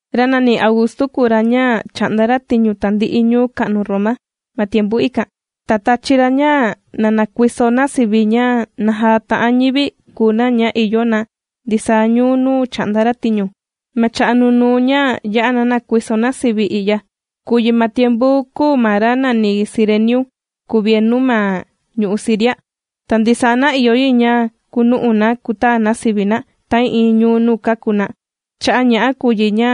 Ra nàni Augustu kùu ra ña chà'nda ra tiñu tandi'i ñuu ka'nu Roma ma tiempu ikan. Ta tāchi ra ña na nakuiso na sivi, ña naja ta'an ñivi kùu na ña ìyo na ndisaa ñuu nuu chà'nda ra tiñu. Ma cha'a' nunuu ña yā'a na nākuiso na sivi i'ya, kūu yi ma tiempu kūu ma ra nàni Cirenio kuvienu ma ñu'u' Siria. Ta ndisaa na ìyo yi ña kunu'u na kutaa na sivi na ta'ii'iin ñuu nuu kāku na. Cha'a' ña'a kùu yi ña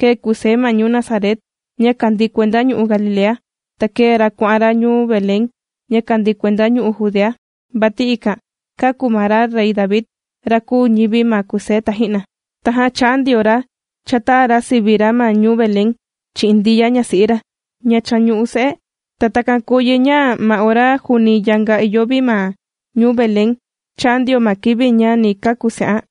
kēe Kusé ma ñuu Nazaret, ña kàndii kuenda ñu'u' Galilea, ta kēe ra kuà'an ra ñuu Belén ña kàndii kuenda ñu'u' Judea, vati ikan kāku ma ra rey David, ra kūu ñivi ma Kusé taji'na. Tajan chā'an ndio ra chātaa ra sivi ra ma ñuu Belén chi'in Ndiya ñasi'i ra, ña cha ñù'u se'e. Ta takan kūu yi ña ma ora juuni yanga ìyo vi ma ñuu Belén, chāa ndio ma kivi ña ni kàku se'an.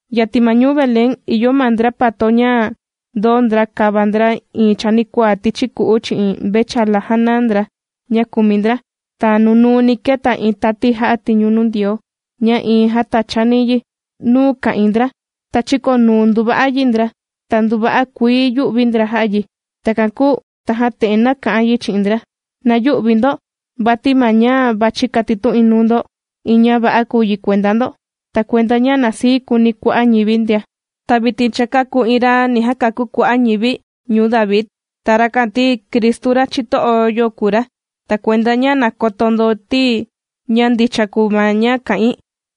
Yatin ma ñuu Belén, ìyo ma ndra pato ña ndōo ndra kāva ndra iin chanikuaa tichi ku'u chi'in mvechala jàna ndra ña kùmi ndra. Ta nunuuni kēta iin tati jà'a tiñu nuu Ndioo ña iin jātachani yi nuu ka'ìin ndra, ta chīkonuu nduva yi ndra. Ta nduva'a kuii yū'vi ndra jà'a yi. Takan kuu tajan te'en nāka'an yi chi'in ndra: ―¡Na yü'vi ndo! Vati ma ña vàchi katitu'in nuu ndo iin ña va'a kùu yi kuenda ndo, ta kuenda ña na sii kuuni kua'a' ñivi ndia, ti vitin cha kāku iin ra ni jakakú kua'a' ñivi ñuu David. Ta rakan ti, Cristu ra chito'o yo kùu ra. Ta kuenda ña na koto ndo ti ña ndicha kùu ma ña kà'in,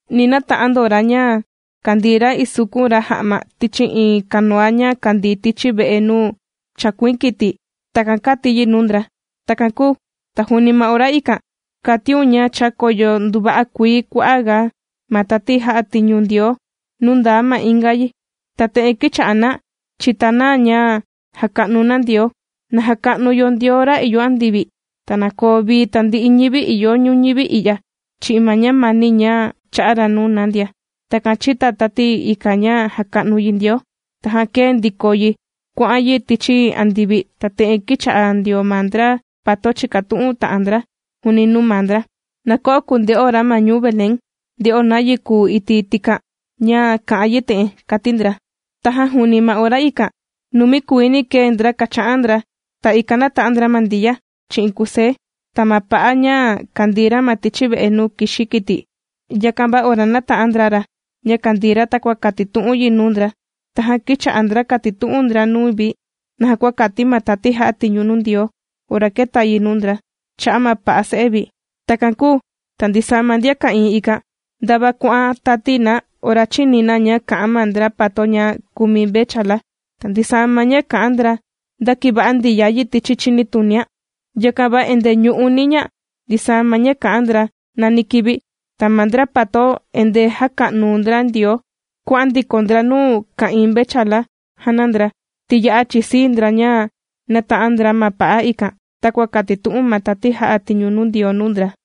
ni nata'an ndo ra ña kàndii ra isukun ra ja'ma tichi iin kanuva ña kàndii tichi ve'e nuu chàkuiin kiti. ―Takan kàti yi nuu ndra. Takan kūu ta juuni ma ora ikan, kàtiun ña chākoyo nduva'a kuii kua'aga ma tati jà'a tiñu Ndioo nuu ndaa ma inga yi. Ta te'en kīcha'a na chìta na ña jàka'nu na Ndioo: ¡Na jaka'nu yo Ndioo ra ìyo andivi! ¡Ta na koo vii tandi'i ñivi ìyo ñuñivi i'ya chi'in ma ñamani ña chà'a ra nuu na ndia! Takan chìta tati ikan ña jàka'nu yi Ndioo. Tajan kēe ndiko yi kuà'an yi tichi andivi, ta te'en kīcha'a ndio ma ndra pato chìkatu'un ta'an ndra juuni nuu maa ndra: ―Na ko'o kunde'o ra ma ñuu Belén, nde'o nayi kūu iti' tikan ña kà'an yi te'en ―kàti ndra. Tajan juuni ma ora ikan, numi kuiini kēe ndra kàcha'an ndra. Ta ikan nāta'an ndra ma Ndiya, chi'in Kusé ta ma pa'a ña kàndii ra ma tichi ve'e nuu kìxi kiti. Yakan va ora nāta'an ndra ra ña kàndii ra takua kātitu'un yi nuu ndra, tajan kīcha'a ndra kàtitu'un ndra nuu vi naja kua kāti ma tati jà'a tiñu nuu Ndioo ora kēta yi nuu ndra cha'a' ma pa'a se'e vi. Takan kūu ta ndisaa ma ndian ka'ìin ikan, ndava kuà'an tati na ora chīni na ña kà'an ma ndra pato ña kùmi mvechala. Ta ndisaa ma ña kà'an ndra ndākiva'a Ndiya yi tichi chinitunian. Yakan va endee ñù'uni ña ndisaa ma ña kà'an ndra nani kivi. Ta ma ndra pato endee jàka'nu ndra Ndioo kuà'an ndiko ndra nuu ka'ìin mvechala jàna ndra, ti ya'a chìsii ndra ña nāta'an ndra ma pa'a ikan takua kātitu'un ma tati jà'a tiñu Ndioo nuu ndra.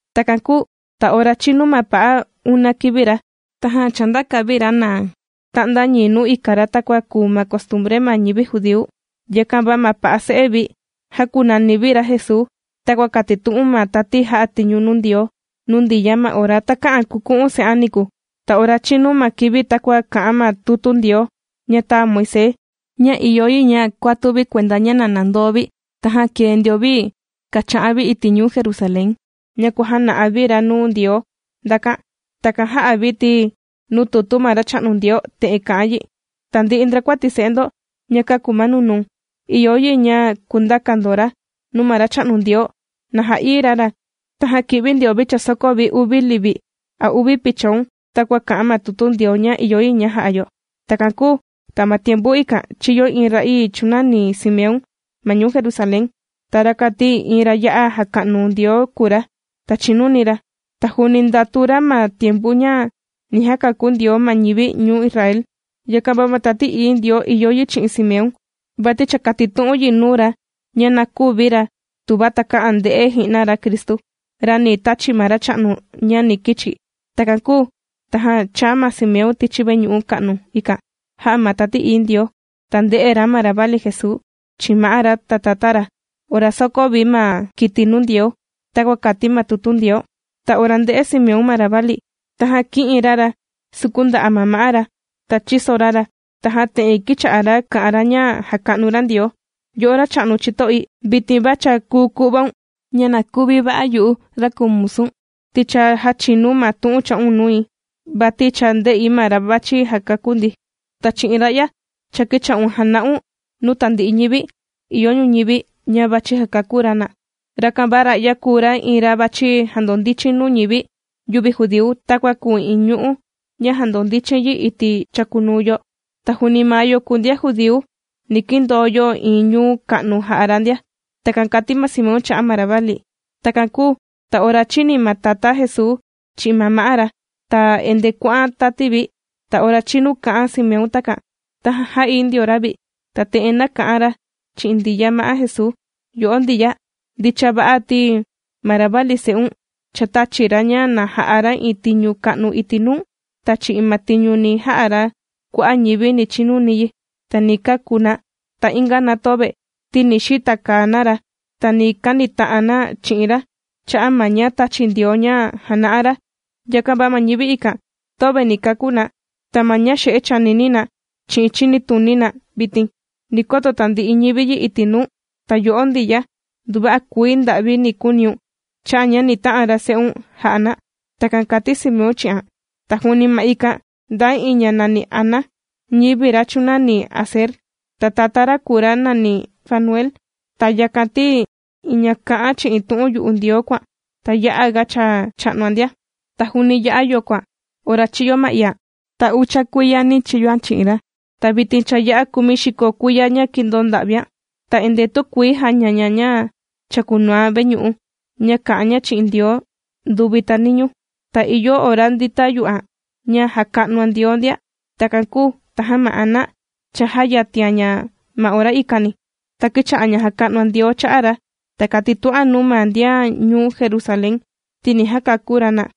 Takan kūu ta ora chīnu ma pa'a una kivi ra, tajan chāndaka vi ra na ta'nda ñii nuu ika ra takua kùu ma costumbre ma ñivi judíu. Yakan va ma pa'a se'e vi jākunani vi ra Jesuu, takua kātitu'un ma tati jà'a tiñu nuu Ndioo nuu Ndiya ma ora takä'an kuku'un se'an niku. Ta ora chīnu ma kivi takua kà'an ma tutu Ndioo ña tāa Moisés, ña ìyo yi ña kuatu vi kuenda ña na nandoo vi, tajan kēe ndio vi kàcha'an vi iti' ñuu Jerusalén ña kuàjana'a vi ra nuu Ndioo ndakan. Takan jā'a vi ti, nuu tutu ma Racha'nu Ndioo te'en kà'an yi: “Tandi'i ndrakuati se'e ndo ña kàku ma nunuu, ìyo yi ña kundaka ndo ra nuu ma Racha'nu Ndioo na ja'ií ra ra.” Tajan kī'vi ndio vi chāsoko vi uvi livi a uvi pichon, takua kà'an ma tutu Ndioo ña ìyo yi ña jà'a yo. Takan kūu ta ma tiempu ikan chīyo iin ra'ii chūnani Simeón ma ñuu Jerusalén. Ta rakan ti iin ra ya'a jàka'nu Ndioo kùu ra, ta chìnuni ra. Ta juuni ndàtu ra ma tiempu ña ni jakakú Ndioo ma ñivi ñuu Israel. Yakan va ma Tati Ií Ndioo ìyo yi chi'in Simeón, vati cha kātitu'un yi nuu ra ña na küvi ra tuva takä'an nde'e ji'na ra Cristu, ra ni tachi ma Racha'nu ña ni kichi. Takan kūu tajan chāa ma Simeón tichi veñu'u ka'nu ikan jā'a ma Tati Ií Ndioo. Ta ndē'e ra ma ravali Jesuu chi'in ma'á ra ta tatá ra ora sōkó vi ma kiti nuu Ndioo takua kàti ma tutu Ndioo. Ta ora ndē'e Simeón ma ravali, tajan kī'in ra ra sukun nda'a' ma ma'á ra ta chīso ra ra. Tajan te'en kīcha'a ra kà'an ra ña jàka'nu ra Ndioo: Yo'o Racha'nu chito'i, vitin va cha kùu ku'vaun ña na kuvi va'a yu'u, ra kùu musu̱n, ti cha jāchinu̱n ma tu'un chā'un nui. Vati cha ndè'i ma ra vàchi jakakú ndi. Ta chi'in ra'ya, cha kīcha'un jàna'un nuu tandi'i ñivi ìyo ñuñivi, ña vàchi jakakú ra na. Yakan va ra'ya kùu ra iin ra vàchi jandondichin nuu ñivi yüvi judíu takua kùu iin ñu'ú ña jàndondichin yi iti' chàkunuu yo. Ta juuni ma yo kùu ndian judíu, ni kindoo yo iin ñuu ka'nu jà'a ra ndia. Takan kàti ma Simeón cha'a' ma ravali. Takan kūu ta ora chīni ma tatá Jesuu chi'in ma ma'á ra, ta endee kuà'an tati vi. Ta ora chinu kā'an Simeón takan, tajan jā'ií ndio ra vi, ta te'en nāka'an ra chi'in Ndiya ma'á Jesuu: ―Yo'o Ndiya, ndicha va'a ti ma ravali se'un cha tāchi ra ña na ja'a ra iin tiñu ka'nu iti' nuu. Ta chi'in ma tiñu ni ja'a ra, kua'a' ñivi ni chinuni yi, ta ni kakú na. Ta inga na töve, ti ni xitakaa na ra, ta ni kanita'an na chi'in ra cha'a' ma ña tāchi Ndioo ña jàna'a ra. Yakan va ma ñivi ikan töve ni kakú na, ta ma ña xe'e chànini na chi'in chinituni na vitin, ni koto tandi'i ñivi yi iti' nuu. Ta yo'o Ndiya, nduva'a kuii nda'vi ni kuuniun cha'a' ña ni ta'an ra se'un ja'a na. ―Takan kàti Simeón chi'an. Ta juuni ma ikan ndaa iin ña nàni Ana, ñivi ra chūnani Aser. Ta tatá ña kùu ra nàni Fanuel. Ta yakan ti, iin ña kà'an chi'in tu'un yu'u Ndioo kùan, ta ya'aga cha cha'nuan ndia. Ta juuni ya'a yokoan ora chīyo ma iian, ta ucha kuiyani chīyoan chi'in ra. Ta vitin cha ya'a kumixiko kumi kuiya ña kīndoo nda'vian. Ta endee tükuii jàña ña ña chàkunuan veñu'u ña kà'an ña chi'in Ndioo nduvi ta niñuu. Ta ìyo ora ndìta yu'an ña jàka'nuan Ndioo ndia. Takan kūu tajan ma Ana, cha jāyatian ña ma ora ikani, ta kīcha'a ña jàka'nuan Ndioo cha'a' ra, ta kātitu'an nuu ma ndian ñuu Jerusalén ti ni jakakú ra na.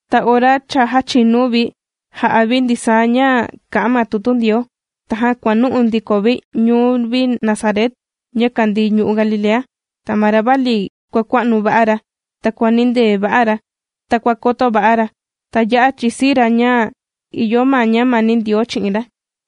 Ta ora cha jāchinu vi jà'a vi ndisaa ña kà'an ma tutu Ndioo, tajan kuànu'u ndiko vi ñuu vi Nazaret ña kàndii ñu'u' Galilea. Ta ma ravali kuàkua'nu va'a ra, ta kuànindee va'a ra, ta kua koto va'a ra. Ta ya'a chìsii ra ña ìyo ma ñamani Ndioo chi'in ra.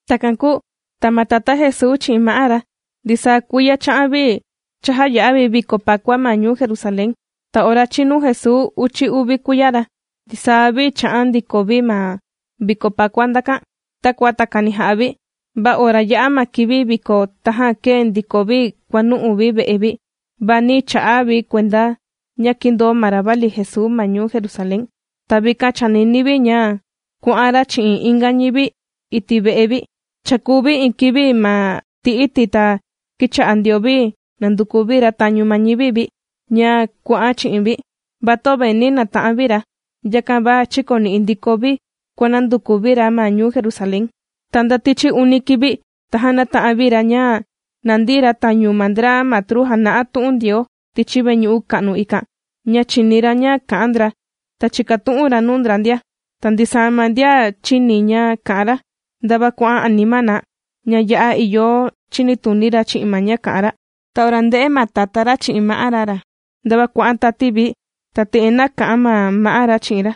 Takan kūu ta ma tatá Jesuu chi'in ma'á ra, ndisaa kuiya chà'an vi chàjaya'a vi viko pakua ma ñuu Jerusalén. Ta ora chīnu Jesuu uchi uvi kuiya ra, ndisaa vi chā'an ndiko vi ma viko pakua ndakan, takua takani jà'a vi. Va ora yā'a ma kivi viko, tajan kēe ndiko vi kuànu'u vi ve'e vi, va nī cha'a vi kuenda ña kīndoo ma ravali Jesuu ma ñuu Jerusalén. Ta vikan chānini vi ña kuà'an ra chi'in inga ñivi vi iti' ve'e vi. Chākuu vi iin kivi ma ti iti' ta kīcha'a ndio vi nànduku vi ra tañu ma ñivi vi, ña kuà'an chi'in vi, va töve nī nata'an vi ra. Yakan va chīkoni'i ndiko vi kuànanduku vi ra ma ñuu Jerusalén. Ta nda tichi uni kivi, tajan nāta'an vi ra ña nàndi ra tañu ma ndra matru jàna'a tu'un Ndioo tichi veñu'u ka'nu ikan, ña chìni ra ña kà'an ndra, ta chìkatu'un ra nuu ndra ndia. Ta ndisaa ma ndian chīni ña kà'an ra, ndava kuà'an anima na, ña ya'a ìyo chinituni ra chi'in ma ña kà'an ra. Ta ora ndē'e ma tatá ra chi'in ma'á ra ra, ndava kuà'an tati vi, ta te'en nāka'an ma ma'á ra chi'in ra: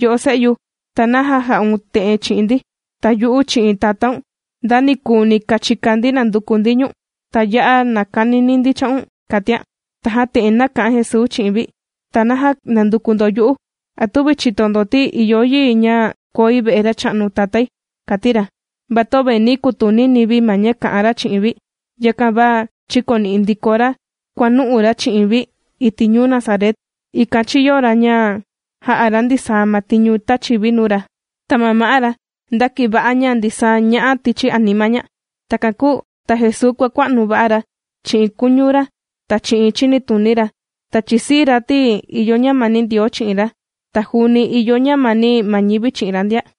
―Yo'o se'yu, ¿ta naja jà'un te'en chi'in ndi? Ta yu'u chi'in tatáun, ndanikuni kāchika ndi nànduku ndi ñu̱n, ta ya'a nàkanini ndi cha'un ―kàtian. Tajan te'en nāka'an Jesuu chi'in vi: ―¿Ta naja nànduku ndo yu'u? ¿A tüvi chìto ndo ti ìyo yi ña koi ve'e Racha'nu Tatái? ―kàti ra. Va töve nī kutunini vi ma ña kà'an ra chi'in vi. Yakan va chīkoni'i ndiko ra kuànu'u ra chi'in vi iti' ñuu Nazaret, ikan chīyo ra ña jā'a ra ndisaa ma tiñu tāchi vi nuu ra. Ta ma ma'á ra ndākiva'a ña ndisaa ña'a tichi anima ña. Takan kūu ta Jesuu kuàkua'nu va'a ra chi'in kuñu ra ta chi'in chinituni ra. Ta chìsii ra ti ìyo ñamani Ndioo chi'in ra, ta juuni ìyo ñamani ma ñivi chi'in ra ndia.